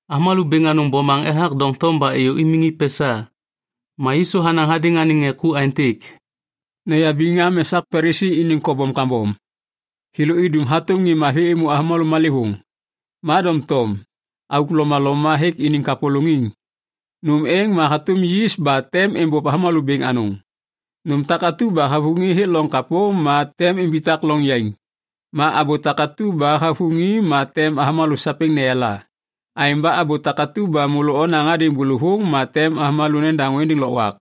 Avômalô bêŋ anôŋ bomaŋ ethak doŋtom ba êyô imiŋ i pesa. Ma Yisu hanaŋ hadêŋ anêŋ ŋê ku aêntêk, “Noyabiŋ am esak Palisi iniŋ kobom kambom. Thêlô idum hatôm ŋê mavi êmô avômalô malêvôŋ, ma doŋtom auk lomaloma hêk iniŋ kapôlôŋiŋ. Nôm êŋ ma hatôm yis ba tem êmbôv avômalô bêŋ anôŋ. Nôm takatu ba havuŋi hêk loŋ kapô ma tem imbitak loŋ yaiŋ. Ma abô takatu ba havuŋi ma tem avômalô sapêŋ neyala. Aêŋ ba abô takatu ba môlô onaŋ hadêŋ bôlôvôŋ ma tem avômalô nedaŋô êndêŋ lôkwak.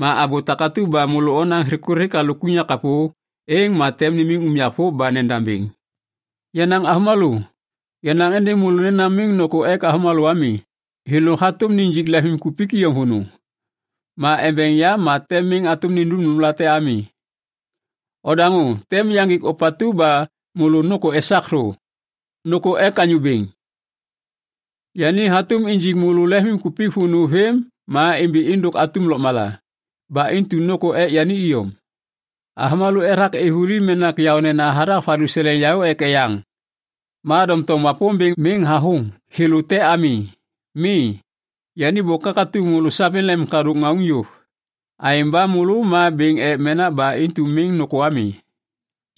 Ma abô takatu ba môlô onaŋ thikuthik halôk unyak kapô, êŋ ma tem nimiŋ unyak vôv ba nendam bêŋ. “Yenaŋ avômalô, yanaŋ êndêŋ môlô nena miŋ nôkô ek avômalô ami. Thêlô hatôm nijik lemvimkupik iyom vônô. Ma embeŋ yam ma tem miŋ hatôm nindum nômlate ami. Odaŋô tem yaŋgik ôpatu ba môlô nôkô esak thô: Nôkô ek Anyô Bêŋ. Yani hatôm injik môlô lemvimkupik vônô vêm ma imbi êndôk atum lôkmala. Ba intu nôkô ek yani iyom. “Avômalô ethak êv vuli menak yaônena hathak valuseleŋ yaô ek eyaŋ. Ma doŋtom Wapômbêŋ miŋ hathôŋ thêlô te ami, mi. Yani bôk hakatuŋ môlô sapêŋ lemimkadôk ŋauŋ yôv. Aêŋ ba môlô ma bêŋ ek menak, ba intu miŋ nôkô ami.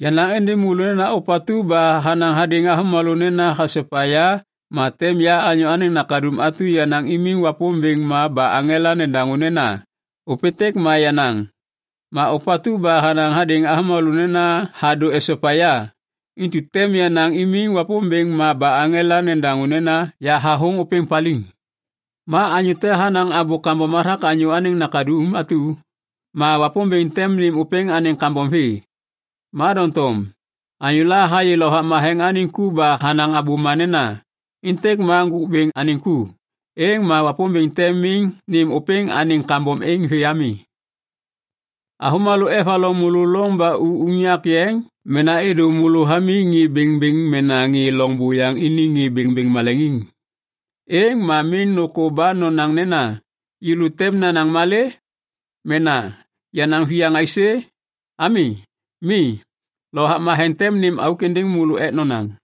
“Yanaŋ êndêŋ môlô nena ôpatu ba hanaŋ hadêŋ avômalô nena hasopa ya ma tem ya Anyô Anêŋ Nakaduŋ atu yanaŋ imiŋ Wapômbêŋ ma ba aŋela nedaŋô nena, ‘Ôpêntêk ma yenaŋ.’ Ma ôpatu ba hanaŋ hadêŋ avômalô nena hadô esopa ya, intu tem yanaŋ imiŋ Wapômbêŋ ma ba aŋela nedaŋô nena, ‘Yahathôŋ ôpêŋ paliŋ.’ Ma anyô te hanaŋ abô kambom hathak Anyô Anêŋ Nakaduŋ atu, ma Wapômbêŋ tem nêm ôpêŋ anêŋ kambom vê. Ma doŋtom anyôla hayê Lovak Matheŋ anêŋ ku ba hanaŋ abôma nena, ‘Êntêk ma Ŋgôk Bêŋ anêŋ ku’, êŋ ma Wapômbêŋ tem miŋ nêm ôpêŋ anêŋ kambom êŋ vê ami. “Avômalô evaloŋ môlô loŋ ba u unyak yeŋ mena êdô môlô hamiŋ ŋê bêŋbêŋ mena ŋê loŋ buyaŋ iniŋ ŋê bêŋbêŋ maleŋiŋ, êŋ ma miŋ nôkô ba nonaŋ nena, ‘Yêlô tem nanaŋ malê?’ mena ‘nanaŋ viyaŋ aisê?’ ami. Mi. Lovak Matheŋ tem nêm auk êndêŋ môlô ek nonaŋ.”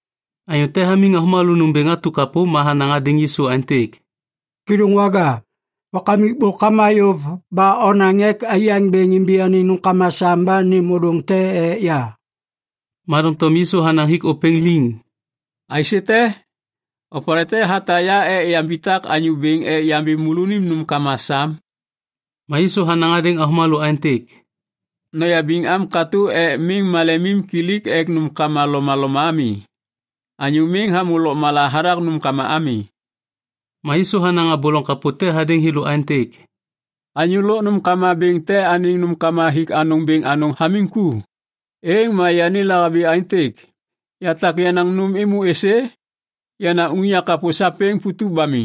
Anyô te hamiŋ avômalô nômbêŋ atu kapô ma hanaŋ hadêŋ Yisu aêntêk, “Kêdôŋwaga, wakamik bôk hama yôv ba onaŋ ek aiyaŋ bêŋ imbi anêŋ nômkama sam ba nêm ôdôŋ te ek ya.” Ma doŋtom Yisu hanaŋ hik ôpêŋ liŋ, “Aisête? Opalê te hatak ya ek yambitak anyô bêŋ ek yambi môlônim nômkama sam?” Ma Yisu hanaŋ hadêŋ avômalô aêntêk, “Noyabiŋ am katô ek miŋ malemimkilik ek nômkama lomaloma ami. Anyô miŋ hamô lôkmala hathak nômkama ami.” Ma Yisu hanaŋ abô loŋ kapô te hadêŋ thêlô aêntêk, “Anyô lôk nômkama bêŋ te anêŋ nômkama hik anôŋ bêŋ anôŋ hamiŋ ku. Êŋ ma yani lahabi aêntêk, ‘Yatak yenaŋ nôm êmô êsê? Yenaŋ unyak kapô sapêŋ putup ba mi.’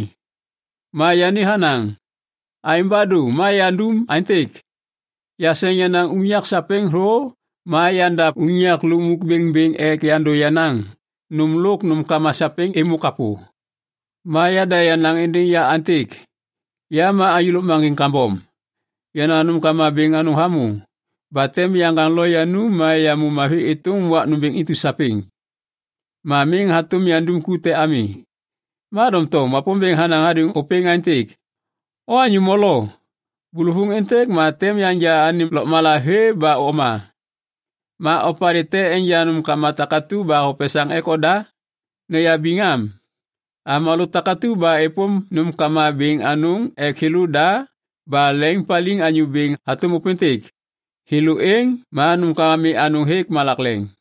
Ma yani hanaŋ, ‘Aêŋ ba dô ma yandum aêntêk. Yaseŋ yenaŋ unyak sapêŋ thô ma yandav unyak lukmuk bêŋbêŋ ek yandô yenaŋ nôm lôk nômkama sapêŋ êmô kapô. Ma yada yanaŋ êndêŋ ya aêntêk, “Ya ma anyô lôkmaŋgiŋ kambom. Yenaŋ nômkama bêŋ anôŋ hamô. Ba tem yaŋgaŋ lo yanum ma yamô mavi iyom êtôm wak nômbêŋ intu sapêŋ. Ma miŋ hatôm yandum ku te ami.” ’ “Ma doŋtom Wapômbêŋ hanaŋ hadêŋ ôpêŋ aêntêk, ‘O anyô molo! Bôlôvôŋ êntêk ma tem yanja anêm lôkmala vê ba oma, ma opalê tem enja nômkama takatu ba hopesaŋ ek oda?’ “Noyabiŋ am! Avômalô takatu ba êpôm nômkama bêŋ anôŋ ek thêlôda ba leŋiŋpaliŋ Anyô Bêŋ hatôm ôpêntêk, thêlô êŋ ma nômkama mi anôŋ hêk malak leŋ.”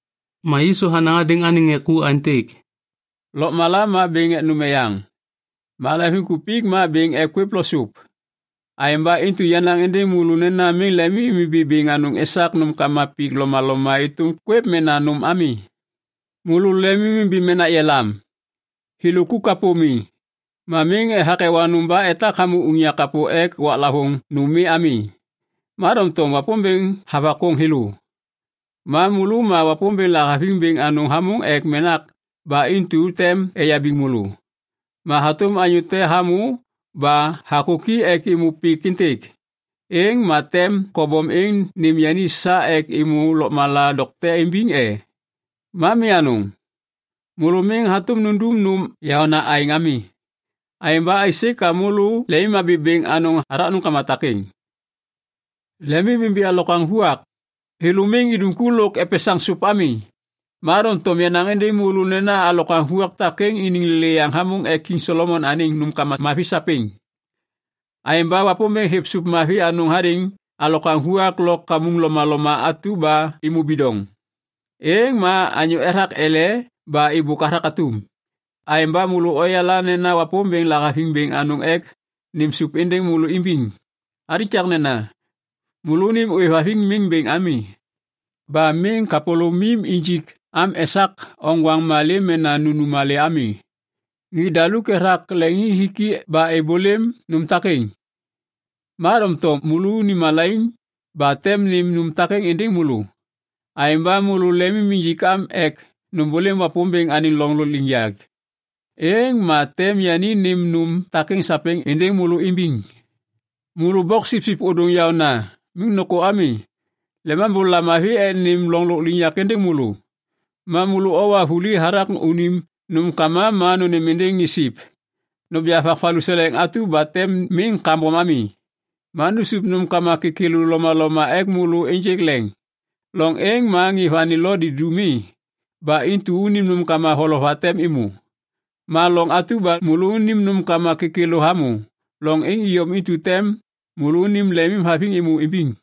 Ma Yisu hanaŋ hadêŋ anêŋ ŋê ku aêntêk, “Lôkmala ma bêŋ ek nôm eyaŋ. Ma leŋviŋkupik ma bêŋ ek kwêv lo sup. Aêŋ ba intu yanaŋ êndêŋ môlô nena miŋ lemimimbi bêŋ anôŋ esak nômkama pik lomaloma êtôm kwêv mena nôm ami. Môlô lemimimbi menak yelam. Thêlô ku kapô mi. Ma miŋ ethak ewa nôm ba etak hamô unyak kapô ek waklavôŋ nôm mi ami. Ma doŋtom Wapômbêŋ havakôŋ thêlô. Ma môlô ma Wapômbêŋ lahaviŋ bêŋ anôŋ hamôŋ ek menak ba intu tem eyabiŋ môlô. Ma hatôm anyô te hamô ba hakôki ek êmô pik êntêk, êŋ ma tem kobom êŋ nêm yani sa ek êmô lôkmala dokte imbiŋ e? Ma mi anôŋ. Môlô miŋ hatôm nundum nôm yaôna aêŋ ami. Aêŋ ba aisê ka môlô lemimhabi bêŋ anôŋ hathak nômkama takêŋ. “Lemimimbi alokwaŋ vuak. Thêlô miŋ idum ku lôk epesaŋ sôp ami. Ma doŋtom yanaŋ êndêŋ môlô nena alokwaŋ vuak takêŋ iniŋ lêlêyaŋ hamôŋ ek Kiŋ Solomon anêŋ nômkama mavi sapêŋ. Aêŋ ba Wapômbêŋ hêv sôp mavi anôŋ hadêŋ alokwaŋ vuak lo kamuŋ lomaloma atu ba êmô bidoŋ, êŋ ma anyô ethak ele ba êbôk hathak atum. Aêŋ ba môlô oyala nena Wapômbêŋ lahaviŋ bêŋ anôŋ ek nêm sôp êndêŋ môlô imbiŋ. Alikaknena, môlônim ôêvhaviŋ miŋ bêŋ ami. Ba miŋ kapôlômim injik am esak oŋgwaŋ malê mena nunum malê ami. Ŋê daluk ethak leŋiŋhiki ba êbôlêm nôm takêŋ, ma doŋtom môlônim Lemambô hayala môlônim malaiŋ ba tem nêm nôm takêŋ êndêŋ môlô. Aêŋ ba môlô lemim injik am ek nômbôlêm Wapômbêŋ anêŋ loŋ lôkliŋyak. Êŋ ma tem yani nêm nôm takêŋ sapêŋ êndêŋ môlô imbiŋ. “Môlô boksipsip ôdôŋ yaôna, miŋ nôkô ami. Lemambô lamavi ek nêm loŋ lôkliŋyak êndêŋ môlô. Ma môlô owa vuli hathak unim nômkama ma nônêm êndêŋ ŋê siv. Noja vak valuseleŋ atu ba tem miŋ kambom ami, ma nusup nômkama kêkêlô lomaloma ek môlô ênjêk leŋ. Loŋ êŋ ma ŋê vani lo didu mi, ba intu unim nômkama valova tem êmô. Ma loŋ atu ba môlônim nômkama kêkêlô hamô, loŋ êŋ iyom intu tem môlônim lemimhaviŋ êmô imbiŋ.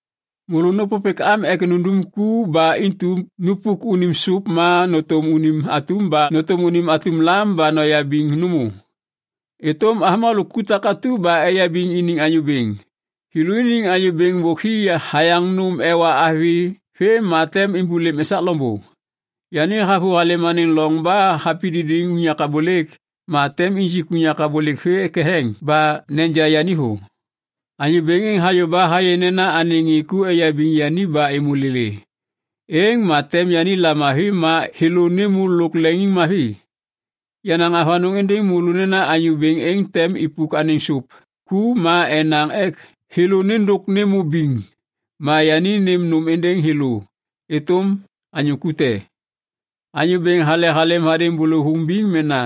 “Môlô nôpôpêk am ek nundum ku ba intu nupuk unim sôp ma nôtôm unim atum lam ba noyabiŋ nômô êtôm avômalô ku takatu ba eyabiŋ iniŋ anyô bêŋ. Thêlôniŋ anyô bêŋ bôk hi hayaŋ nôm ewa avi vêm ma tem êmbôlêm esak loŋbô. Yani havôhalêm anêŋ loŋ ba hapididiŋ unyak abôlêk ma tem nijik unyak abôlêk vê ketheŋ ba neja yani thô. Anyô bêŋ êŋ hayô ba hayê nena anêŋ ŋê ku eyabiŋ yani ba êmô lêlê, êŋ ma tem yani lamavi ma thêlô nêmô lôk leŋiŋmavi. Yanaŋ avanôŋ êndêŋ môlô nena anyô bêŋ êŋ tem ipuk anêŋ sôp ku ma enaŋ ek thêlô nêndôk nêmô biŋ ma yani nêm nôm êndêŋ thêlô êtôm anyô ku te. Anyô bêŋ hale halêm hadêŋ bôlôvôŋ biŋ mena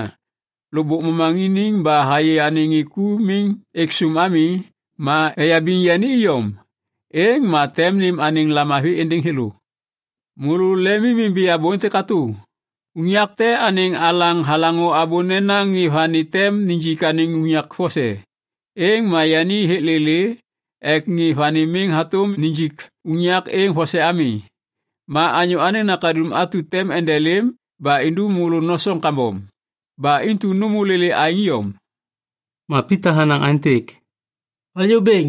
lôkbôk momaŋiniŋ ba hayê anêŋ ŋê ku miŋ êk sôm ami ma eyabiŋ yani iyom, êŋ ma tem nêm anêŋ lamavi êndêŋ thêlô. “Môlô lemimimbi abô êntêk katô. Unyak te anêŋ alaŋ halaŋô abô nena ŋê vani tem nijik anêŋ unyak vose, êŋ ma yani hêk lêlê ek ŋê vani miŋ hatôm nijik unyak êŋ vose ami. Ma Anyô Anêŋ Nakaduŋ atu tem endelêm ba indum môlô nosoŋ kambom. Ba intu nômô lêlê aêŋ iyom.” Ma Pita hanaŋ aêntêk, “Anyô Bêŋ,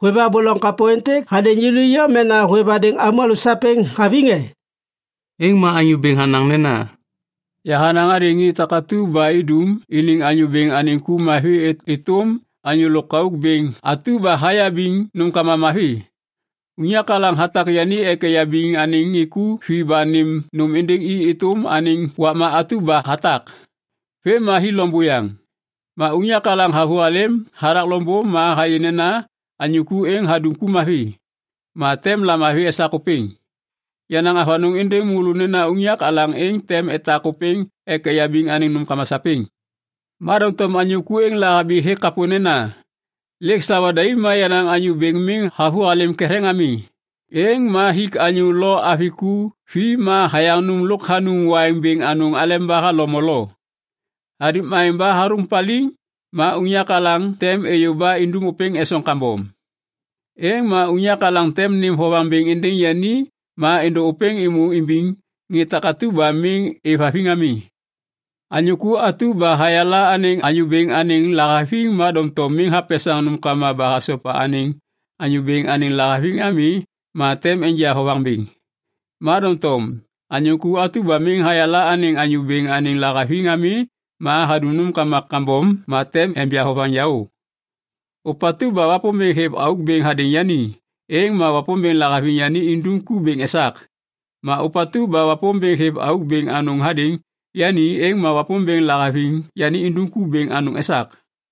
hôêv abô loŋ kapô êntêk hadêŋ yêlô iyom mena hôêv hadêŋ avômalô sapêŋ haviŋ e?” Êŋ ma Anyô Bêŋ hanaŋ nena, “Yahanaŋ hadêŋ ŋê takatu ba idum iniŋ anyô bêŋ anêŋ ku mavi êtôm anyô lôkauk bêŋ atu ba hayabiŋ nômkama mavi. Unyak alaŋ hatak yani ek eyabiŋ anêŋ ŋê ku vi ba nêm nôm êndêŋ i êtôm anêŋ wakma atu ba hatak. Vêm ma hi loŋ buyaŋ. Ma unyak alaŋ havôhalêm hathak loŋbô ma hayê nena anyô ku êŋ hadum ku mavi, ma tem lamavi esak ôpêŋ. Yanaŋ avanôŋ êndêŋ môlô nena unyak alaŋ êŋ tem etak ôpêŋ ek eyabiŋ anêŋ nômkama sapêŋ. Ma doŋtom anyô ku êŋ lahabi hêk kapô nena, ‘Lêk sawa daim ma yenaŋ anyô bêŋ miŋ havôhalêm ketheŋ ami.’ Êŋ ma hik anyô lo avi ku vi ma hayaŋ nôm lôk hanum waiŋ bêŋ anôŋ aleba halo molo. Hadum aêŋ ba hathôŋ paliŋ ma unyak alaŋ tem êyô ba indum ôpêŋ esoŋ kambom. Êŋ ma unyak alaŋ tem nêm vovaŋ bêŋ êndêŋ yani ma êndô ôpêŋ êmô imbiŋ ŋê takatu ba miŋ êvhaviŋ ami. “Anyô ku atu ba hayala anêŋ anyô bêŋ anêŋ lahaviŋ ma doŋtom miŋ hapesaŋ nômkama ba hasopa anêŋ anyô bêŋ anêŋ lahaviŋ ami ma tem enja vovaŋ bêŋ. Ma doŋtom anyô ku atu ba miŋ hayala anêŋ anyô bêŋ anêŋ lahaviŋ ami ma hadum nômkama kambom ma tem enja vovaŋ yaô. “Ôpatu ba Wapômbêŋ hêv auk bêŋ hadêŋ yani, êŋ ma Wapômbêŋ lahaviŋ yani indum ku bêŋ esak. Ma ôpatu ba Wapômbêŋ hêv auk bêŋ anôŋ hadêŋ yani, êŋ ma Wapômbêŋ lahaviŋ yani indum ku bêŋ anôŋ esak.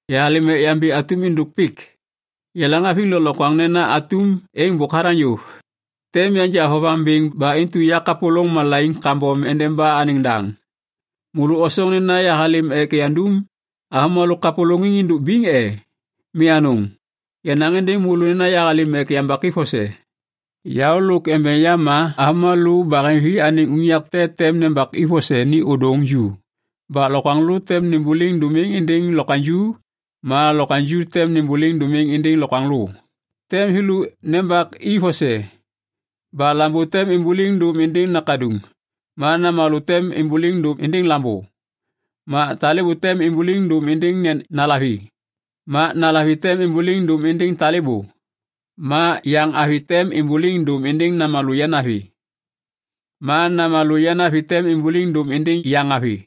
“Yahalêm ek yambi atum êndôk pik. Yaleŋhaviŋ lôklokwaŋ nena atum êŋ bôk hathaŋ yôv. Tem yanja vovaŋ bêŋ ba intu yakapôlôŋ malaiŋ kambom endeba anêŋ daŋ. Môlô osoŋ nena yahalêm ek yandum avômalô kapôlôŋiŋ êndôk biŋ e? Mi anôŋ! Yanaŋ êndêŋ môlô nena yahalêm ek yambak i vose. Yaô lôk embeŋ yam ma avômalô baheŋvi anêŋ unyak te tem nembaki vose ni ôdôŋ ju ba lokwaŋlô tem nêmbôliŋ dômiŋ êndêŋ lokwaŋju ma lokwaŋju tem nêmbôliŋ dômiŋ êndêŋ lokwaŋlô. Tem thêlô nembak i vose, ba lambô tem êmbôliŋ dôm êndêŋ nakaduŋ, ma namalô tem êmbôliŋ dôm êndêŋ lambô, ma talêbô tem êmbôliŋ dôm êndêŋ nalavi, ma nalavi tem êmbôliŋ dôm êndêŋ talêbô, ma yaŋavi tem êmbôliŋ dôm êndêŋ namalô yanavi, ma namalô yanavi tem êmbôliŋ dôm êndêŋ yaŋavi.”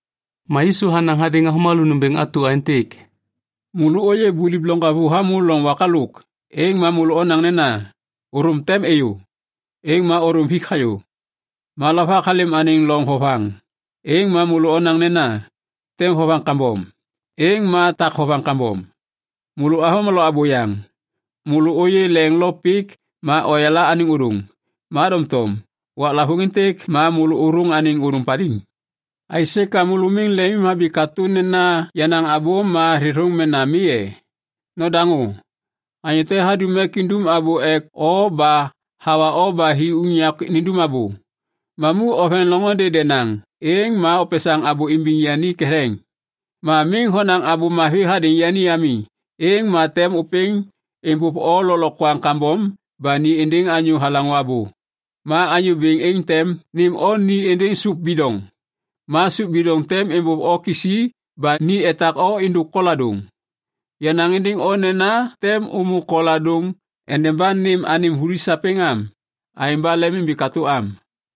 Ma Yisu hanaŋ hadêŋ avômalô nômbêŋ atu aêntêk, “Môlô ôyê buliv loŋgavu hamô loŋ wak halôk, êŋ ma môlô onaŋ nena, ‘Ôthôm tem êyô.’ Êŋ ma ôthôm hik hayô. Ma lovak halêm anêŋ loŋ vovaŋ, êŋ ma môlô onaŋ nena, ‘Tem vovaŋ kambom.’ Êŋ ma tak vovaŋ kambom. Môlô avômalô abôyaŋ. Môlô ôyê leŋ lo pik ma oyala anêŋ ôdôŋ, ma doŋtom waklavôŋ êntêk ma môlô ôthôŋ anêŋ ôdôŋ paliŋ. “Aisê ka môlô miŋ lemimhabi katô nena yenaŋ abô ma thêthôŋ mena mi e? Nodaŋô! Anyô te hadum ek idum abô ek o ba hawa o ba hi unyak nindum abô. Mamu oveŋ loŋôndê denaŋ, êŋ ma opesaŋ abô imbiŋ yani ketheŋ. Ma miŋ honaŋ abô mavi hadêŋ yani ami, êŋ ma tem ôpêŋ êmbôv o lôklokwaŋ kambom ba ni êndêŋ anyô halaŋô abô. Ma anyô bêŋ êŋ tem nêm o ni êndêŋ sôp bidoŋ. Ma sôp bidoŋ tem êmbôv o kisi ba ni etak o êndôk koladôŋ. Yanaŋ êndêŋ o nena tem ômô koladôŋ endeba nêm anêm vuli sapêŋ am. Aêŋ ba lemimbi katô am!”